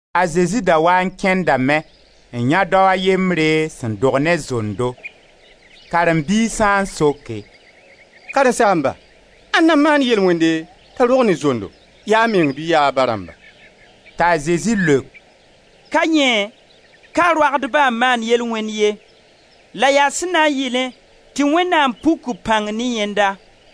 A Zezi da waa n kẽndame, n yãe dao a yembre sẽn dog ne zondo. Karen-biisã n soke: «Karen-saamba, ãnna n maan yel-wẽnde t'a rog ne zondo? Ya a meng bɩ ya a ba rãmba?» T'a Zezi leok: «Ka yẽ, ka a roagdba n maan yel-wẽnd ye, la yaa sẽn na yɩlẽ tɩ Wẽnnaam puk b pãng ne yẽnda.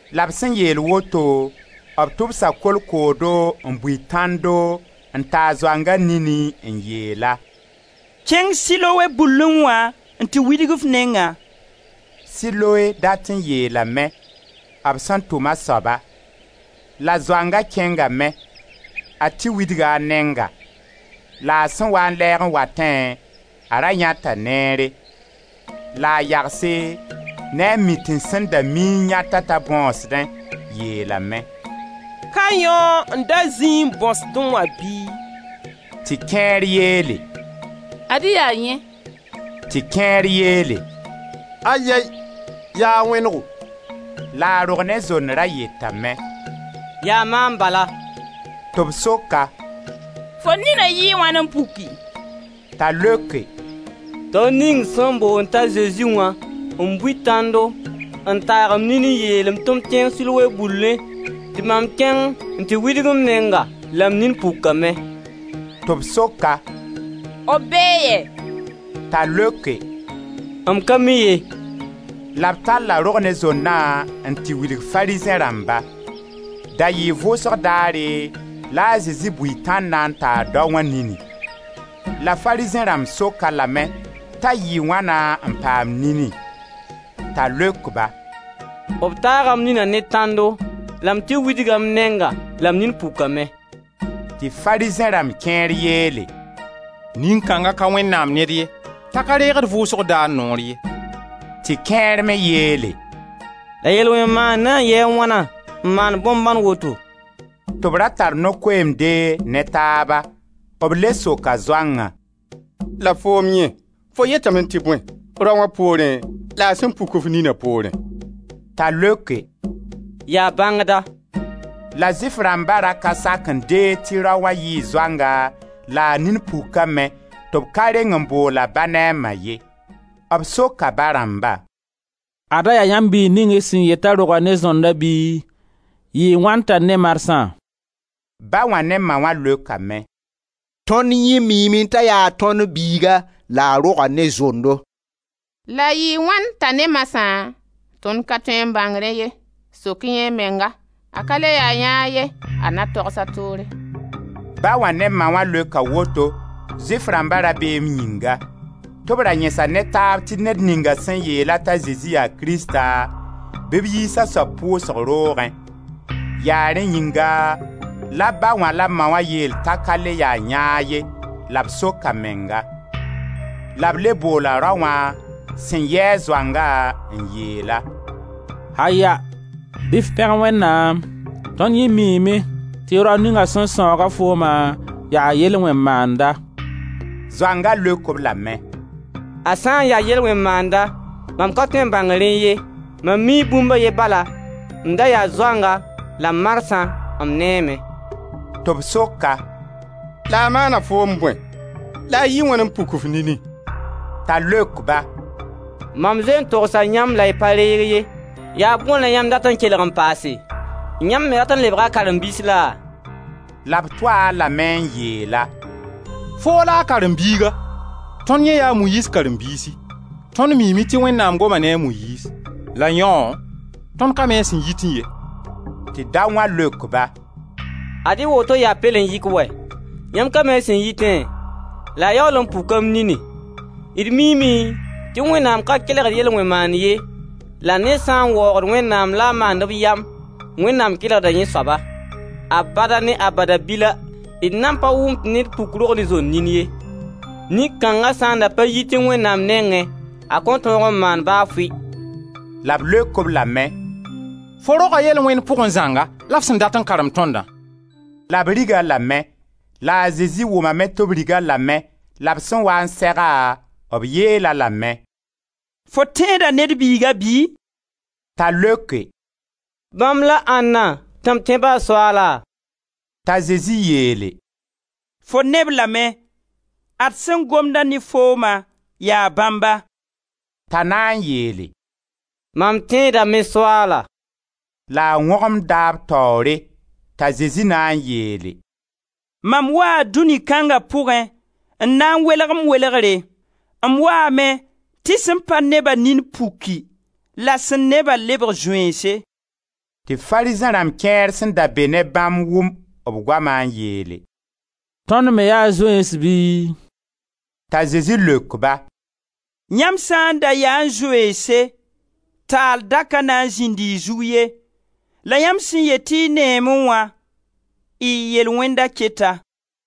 La b sẽn yeel woto, b tʋbsa kolkoodo n bui tãndo n taag zoanga nini, n yeel-a: «Kẽng Siloe bullẽ wã n tɩ widg f nengã» — Siloe dat n yeelame: b sẽn tʋm a soaba. — La zoanga kẽngame, a tɩ widga a nenga, la a sẽn waa n lɛɛg n watẽ a ra yãeta neere. La a yagse ne a mitẽns sẽn da mi n yãet-a t'a bõsdẽ, yeelame: «Ka yãoo n da zĩ n bõsdẽ wã bɩ?» Tɩ kẽer yeele: «Ad-y yaa yẽ!» Tɩ kẽer yeele: «Ayɛy! Yaa a wẽnego.» La a Rog-ne-zond ra yetame: «Yaa maam bala!» Tɩ b sok-a: «Fo nina yɩɩ wãna n puki?» T'a leoke: «Dao ning sẽn boond t'a Zezi wã n bui tãndo n taag m nini n yeel-m tɩ m tɩ widg m neng Siloe bullẽ, tɩ mam kẽng n tɩ widg m nenga la m nin pukame.» Tɩ b sok-a: «B bee yɛ?» T'a leoke: «M ka mi ye.» La b talla rog-ne-zondã n tɩ wilg Farizẽ rãmba. Da yɩɩ vʋʋsg daare la a Zezi bui tãndã n taag daoã nini. La Farizẽ rãmb sok-a lame t'a yɩɩ wãna n paam nini. T'a leok-ba: «B taaga m nina ne tãndo la m tɩ widga m nenga, la m nin pukame.» Tɩ Farizẽ rãmb kẽer yeele: «Nin-kãnga ka Wẽnnaam ned ye t'a ka reegd vʋʋsg daar noor ye.» Tɩ kẽer me yeele: «La yel-wẽn-maand na n yɩɩ wãna n maan bõn-bãn woto!» Tɩ b ra tar no-koeemde ne taaba. B le soka zoangã: «La foom yẽ, fo yetame tɩ bõe, raoã poorẽ la a sẽn puk f nina poorẽ?» T'a leoke: «Yaa bãngda!» La Zʋɩf rãmba ra ka sak n deeg tɩ raoã yɩɩ zoanga la a nin pukame, tɩ b ka reng n bool a ba ne a ma ye. B soka ba rãmba: «Ada yaa yãmb biig ning y sẽn yet t'a roga ne zonda bɩ? Yɩɩ wãn t'a ne marsã?» Ba wã ne ma wã leokame: «Tõnd yẽ miime t'a yaa tõnd biiga la a roga ne zondo, la yɩɩ wãn t'a ne marsã, tõnd ka tõe n bãng rẽ ye, sok yã a menga, a ka le ya yãag ye, a na togs a toore.» Ba wã ne ma wã leoka woto, Zʋɩf rãmba rabeem yĩnga tɩ b ra yẽsa ne taab tɩ ned ninga sẽn yeela t'a Zezi yaa Krista, bɩ b yiis a soab pʋʋsg roogẽ. Yaa rẽ yĩnga la ba wã la ma wã yeel t'a ka le ya yãag ye la b sok a menga. La b le boola raoã sẽn yɩ-a zoanga n yeel-a: «Aya, bɩ b f pẽg Wẽnnaam! Tõnd yẽ miime tɩ rao ning sẽn sãooga fooma yaa yel-wẽn-dmaanda.» Zoanga leok-b lame: «A sã n ya yel-wẽn-maanda, mam ka tõe n bãng rẽ ye. Mam mii bũmb a ye bala: m da yaa zoanga la marsã m neeme.» Tɩ b sok-a: «La a maana foom bõe, la a yɩɩ wãn n puk f nini?» T'a leok-ba: «Mam zoe n togsa yãmb, la y pa reeg ye, yaa bõe la yãmb dat n kelg n paase? Yãmb me rat n lebga a karen-biis laa?» La b tʋ-a lame n yeel-a: «Foo la a karen-biiga, tõnd yẽ yaa a Moyiiz karen-biisi. Tõnd miime tɩ Wẽnnaam goma ne a Moyiiz, la yãoo, tõnd ka mi a sẽn yitẽ ye.» Tɩ daoã leok-ba: «Ad-y woto yaa pɛlen-yɩk wɛ! Yãmb ka mi a sẽn yitẽ la a yaool n puka m nini. D miime tɩ Wẽnnaam ka kelgd yel-wẽn-maand ye la ned sã n waoogd Wẽnnaam la a maand b yam, Wẽnnaam kelgda yẽ soaba. Abada ne abadabila, d nan pa wʋm tɩ ned puk rog-ne-zond nin ye. Nin kãnga sã n da pa yitẽ Wẽnnaam nengẽ a kõn tõog n maan ba fɩ.» La b leok-a lame: «Fo roga yel-wẽnd pʋgẽ zãnga la f sẽn dat n karem tõnda!» La b rig-a lame. La a Zezi wʋmame tɩ b rig-a lame la b sẽn waa n seg-a, b yeel-a lame: «Fo tẽeda Ned Biiga bɩ?» T'a leoke: «Bãmb la ãnna, tɩ m tẽ-ba, Soaala?» T'a Zezi yeele: «Fo neb lame, ad sẽn gomd-a ne fooma, yaa bãmba.» T'a na n yeele: «Mam tẽedame, Soaala!» La a wõgemda b taoore. T'a Zezi na n yeele: «Mam waa dũni kãnga pʋgẽ, n na n welg m welgre. M waame tɩ sẽn pa ne-ba nin puki la sẽn ne-bã lebg zoeense.» Tɩ Farizẽ rãmb kẽer sẽn da be ne bãmb wʋm b goama n yeele: «Tõnd me yaa zoeens bɩ?» T'a Zezi leok-ba: «Yãmb sã n da yaẽ zoeense, taal da ka na n zĩnd y zug ye; la yãmb sẽn yet tɩ y neeme wã, y yel-wẽnda keta.